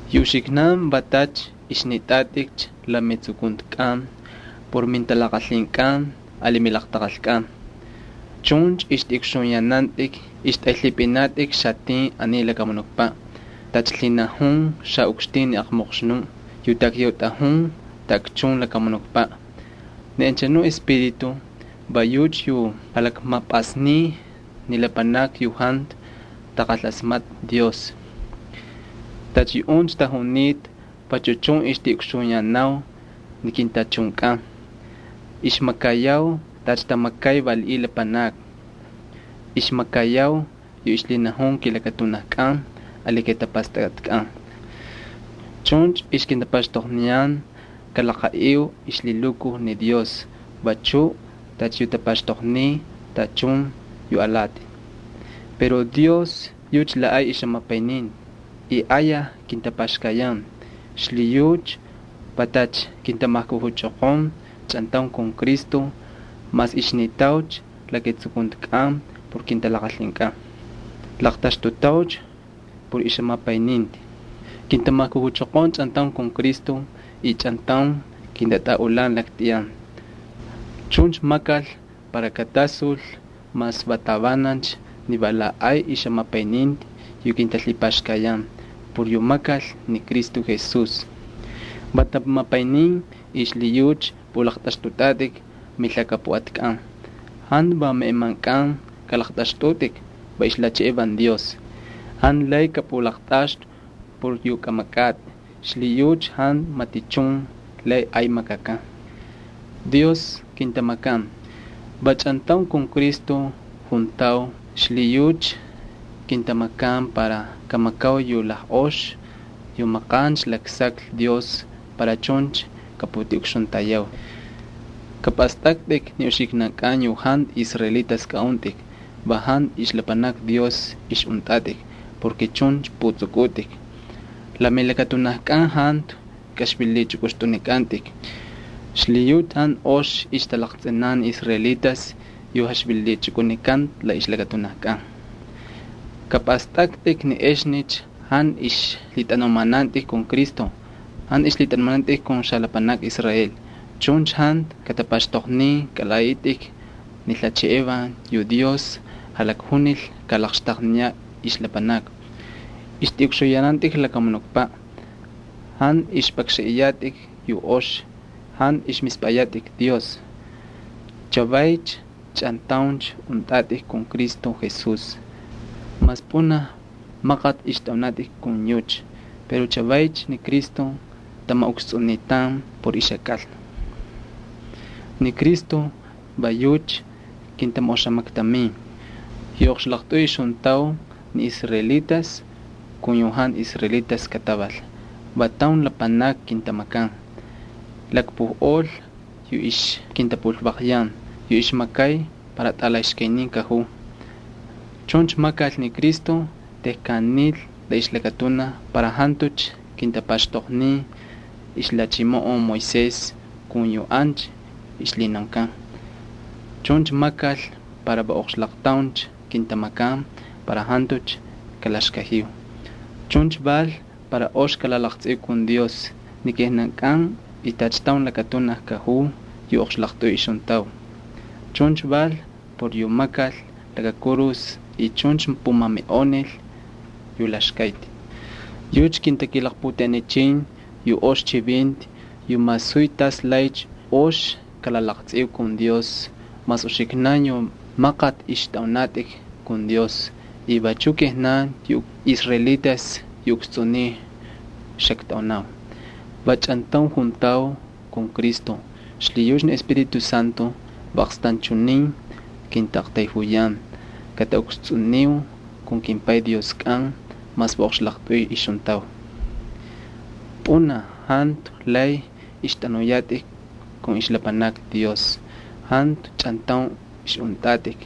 Yu uxiknan va tacha ixnitꞌatꞌikcha la metsukuntikꞌan por mintalaqalhinkꞌan ali milaqtaqalkꞌan. Chuncha ixtꞌiꞌukxuyanantꞌik y ixtꞌaylhipꞌinatꞌik xatin aniy lakamunukpaꞌ tacha lhinajun xaꞌukxtin ni aqmoqxnuꞌ yu takyautꞌajun taꞌakchun ni lakamunukpaꞌ. Ni anchanuꞌ espíritu va yucha yu jalakmapꞌasniy ni lapanakni yu jantu taqalasmatꞌa Dios. Tacha yuꞌuncha tajunita vachu chun ixtiꞌukxuyanau ni kintachunkꞌan. Ixmakayau tacha tamakay yu valiꞌiy lapanakni, ixmakayau yu ixlhinajun kilakatunajkꞌan ali kijatapastakꞌatkꞌan. Chuncha ixkintapaxtoqniyan kalaqaꞌiu ixlhilukuj ni Dios vachu tacha yu tapaxtoqniy tachun yu alati. Pero Dios yucha la ay ixjamapayninti y ayaj kintapaxkayan. Xlhiyucha kintamajkujuchoqon chꞌantaun kun Cristo mas ixnitaucha la ketsukuntikꞌan por kintalaqalhinkꞌan. Laqtaxtutaucha por ixjamapayninti. Kintamajkujuchoqon chꞌantaun kun Cristo y chꞌantaun kintatꞌaꞌulan laktꞌiyan. Chuncha makal para katasul mas va tavanancha ni va la ay ixjamapayninti yu kintalhipaxkayan por yu makal ni Cristo Jesús. Va tamapaynin y xlhiyucha pꞌulaqtꞌaxtꞌutꞌatꞌik milhakapuꞌatkꞌan. Jantu va meꞌemankꞌan kꞌalaqtꞌaxtꞌutꞌik, va ixlhacheꞌevan ni Dios. Jantu lay kꞌapꞌulaqtꞌaxtꞌu por yu kꞌamakꞌatꞌi, xlhiyucha jantu matichun lay ay makakan. Dios kintamakan. Va chꞌantaun kun Cristo juntau xlhiyucha kintamakan para kamakau yu lajꞌox yu maqancha laksaklhi Dios para chuncha kaputiꞌukxuntayau. Kapꞌastꞌaktꞌik ni uxiknankꞌan yu jantu israelitas kꞌaꞌuntꞌik, va jantu ixlapanakni Dios ixꞌuntꞌatꞌik porke chuncha pꞌutsꞌukꞌutꞌik. La milakatunajkꞌan jantu kaxvililichꞌukꞌupꞌuxnikꞌantꞌik, xlhiyucha jantu ox ixtalaqtsꞌinan ni israelitas yu jalakxvililichukꞌunikanta la ixlakatunajkꞌan. Kꞌapꞌastꞌaktꞌik ni exnicha jantu ixlhitꞌanumanantꞌik kun Cristo, y jantu ixlhitꞌanumanantꞌik kun xalapanakni Israel. Chuncha jantu katapaxtoqnin kalaꞌaꞌitꞌik ni lhacheꞌevan yu Dios jalakjunil kalaqxtaqniyaꞌ ixlapanakni. Ixtꞌiꞌukxuyanantꞌik lakamunukpaꞌ. Jantu ixpꞌakxanꞌiyatꞌik yu ox y jantu ixmispꞌayatꞌik Dios. Chavaycha chꞌantauncha untꞌatꞌik kun Cristo Jesús. Mas pꞌunaj maqati ixtꞌaunatꞌik kun yucha pero chavaycha ni Cristo tamaꞌukstsꞌunitan por ixjakꞌalna. Ni Cristo va yucha kintamaꞌoxamaktamin. Yu oqxlaqtꞌuy ixjuntau, ni israelitas kun yu jantu israelitas kataval, va taun lapanaki kintamakan. Lakpujꞌol yu ixkintapulvaqyan yu ixmakay para tꞌalaxkaynin kajuu. Chuncha makal ni Cristo tejkan nil la ixlakatunaj para jantucha kintapaxtoqnin ixlhachimoꞌon Moisés kun yu ancha ixlhinaunkan. Chuncha makal para va oqxlaqtauncha kintamakan para jantucha kalaxkajiu. Chuncha val para ox kalalaqtsꞌiu kun Dios ni kijnankꞌan y tacha taun lakatunaj kajuu yu oqxlaqtꞌuy ixjuntau. Chuncha val por yu makal laka kurus y chuncha pumamiꞌonil yu laxkayati. Yucha kintakilaqputeꞌenichin yu ox chivinti yu masuy tas laycha ox kalalaqtsꞌiu kun Dios mas uxiknan yu maqati ixtꞌaunatꞌik kun Dios y vachuꞌ kijnan yu israelitas yu ukstsꞌuniy xaktꞌaunau. Va chꞌantaun juntau kun Cristo xlhiyucha ni Espíritu Santo va aqstanchunin kintaꞌaqtayjuyan kataꞌukstsꞌuniu kun kimPay Dioskꞌan mas va oqxlaqtꞌuy ixjuntau. Pꞌunaj jantu lay ixtꞌanuyatꞌik kun ixlapanakni Dios, jantu chꞌantaun ixꞌuntꞌatꞌik.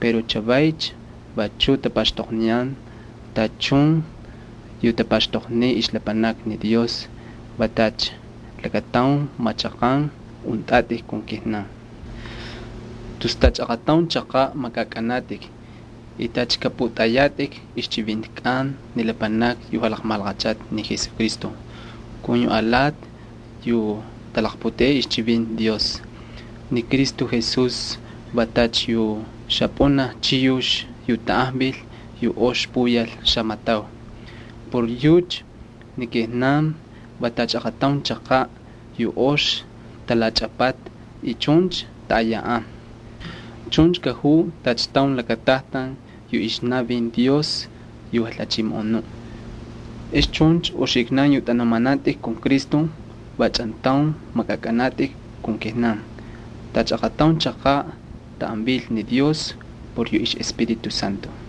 Pero chavaycha vachuꞌ tapaxtoqniyan tachun yu tapaxtoqniy ixlapanakni ni Dios, va tacha lakataun machaqan untꞌatꞌik kun kijnan. Tus tacha aqataun chaqaꞌ makꞌakꞌanatꞌik y tacha kꞌapꞌutꞌayatꞌik ixchivintikꞌan ni lapanakni yu jalaqmalaqachal ni Jesucristo kun yu alati yu talaqputeꞌey ixchivinti Dios. Ni Cristo Jesús va tacha yu xapꞌunaj chiyux yu tanꞌajvil yu ox puyal xamatau. Por yucha ni kijnan va tacha aqataun chaqaꞌ yu ox talachꞌapata y chuncha taꞌayaꞌan. Chuncha kajuu tacha taun lakatajtan yu ixnavin ni Jalhachimoꞌonuꞌ Dios. Ex chuncha uxiknan yu tꞌanumanantꞌik kun Cristo va chꞌantaun makꞌakꞌanatꞌik kun kijnan tacha aqataun chaqaꞌ taꞌan vil ni Dios por yu ixꞌEspíritu Santo.